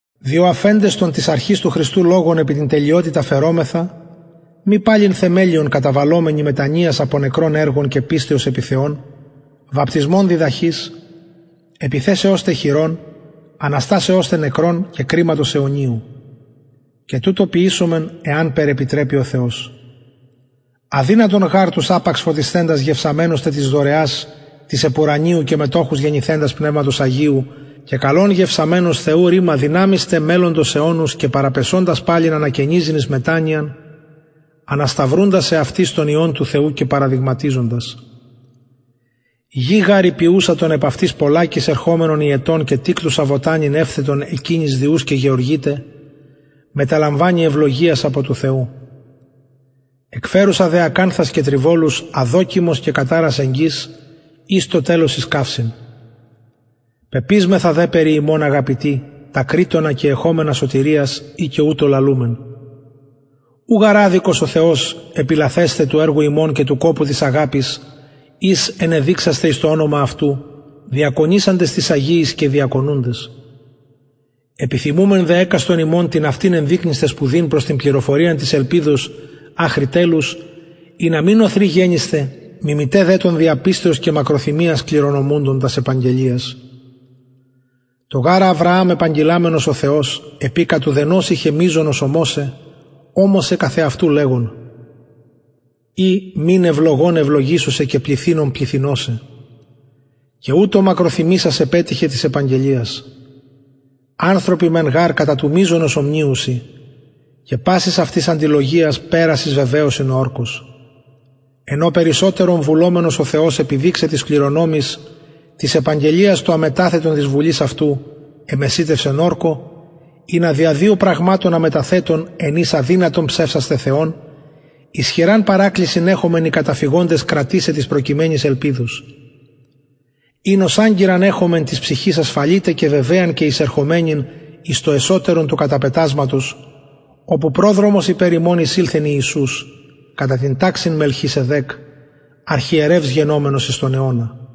διο αφεντες τον της αρχης του χριστου λογον επι την τελειοτητα φερωμεθα μη παλιν θεμελιον καταβαλλομενοι μετανοιας απο νεκρων εργων και πιστεως επι θεον βαπτισμων διδαχης επιθεσεως τε χειρων αναστασεως τε νεκρων και κριματος αιωνιου και τουτο ποιησωμεν εανπερ επιτρεπη ο θεος αδυνατον γαρ τους απαξ φωτισθεντας γευσαμενους τε της δωρεας της επουρανιου και μετοχους γενηθεντας πνευματος αγιου και καλον γευσαμενους θεου ρημα δυναμεις τε μελλοντος αιωνος και παραπεσοντας παλιν ανακαινιζειν εις μετανοιαν ανασταυρουντας εαυτοις τον υιον του θεου και παραδειγματιζοντας γη γαρ η πιουσα τον επ αυτης πολλακις ερχομενον υετον και τικτουσα βοτανην ευθετον εκεινοις δι ους και γεωργειται μεταλαμβανει ευλογιας απο του θεου εκφερουσα δε ακανθας και τριβολους αδοκιμος και καταρας εγγυς ης το τελος εις καυσιν πεπεισμεθα δε περι υμων αγαπητοι τα κρεισσονα και εχομενα σωτηριας ει και ουτως λαλουμεν ου γαρ αδικος ο θεος επιλαθεσθαι του εργου υμων και του κοπου της αγαπης ης ενεδειξασθε εις το ονομα αυτου διακονησαντες τοις αγιοις και διακονουντες επιθυμουμεν δε εκαστον υμων την αυτην ενδεικνυσθαι σπουδην προς την πληροφοριαν της ελπιδος αχρι τελους ινα μη νωθροι γενησθε μιμηται δε των δια πιστεως και μακροθυμιας κληρονομουντων τας επαγγελιας τω γαρ αβρααμ επαγγειλαμενος ο θεος επει κατ ουδενος ειχεν μειζονος ομοσαι ωμοσεν καθ εαυτου λεγων η μην ευλογων ευλογησω σε και πληθυνων πληθυνω σε και ουτως μακροθυμησας επετυχεν της επαγγελιας ανθρωποι μεν γαρ κατα του μειζονος ομνυουσιν και πασης αυτοις αντιλογιας περας εις βεβαιωσιν ο ορκος εν ω περισσοτερον βουλομενος ο θεος επιδειξαι τοις κληρονομοις της επαγγελιας το αμεταθετον της βουλης αυτου εμεσιτευσεν ορκω ινα δια δυο πραγματων αμεταθετων εν οις αδυνατον ψευσασθαι θεον ισχυραν παρακλησιν εχωμεν οι καταφυγοντες κρατησαι της προκειμενης ελπιδος ην ως αγκυραν εχομεν της ψυχης ασφαλη τε και βεβαιαν και εισερχομενην εις το εσωτερον του καταπετασματος οπου προδρομος υπερ ημων εισηλθεν ιησους κατα την ταξιν μελχισεδεκ αρχιερευς γενομενος εις τον αιωνα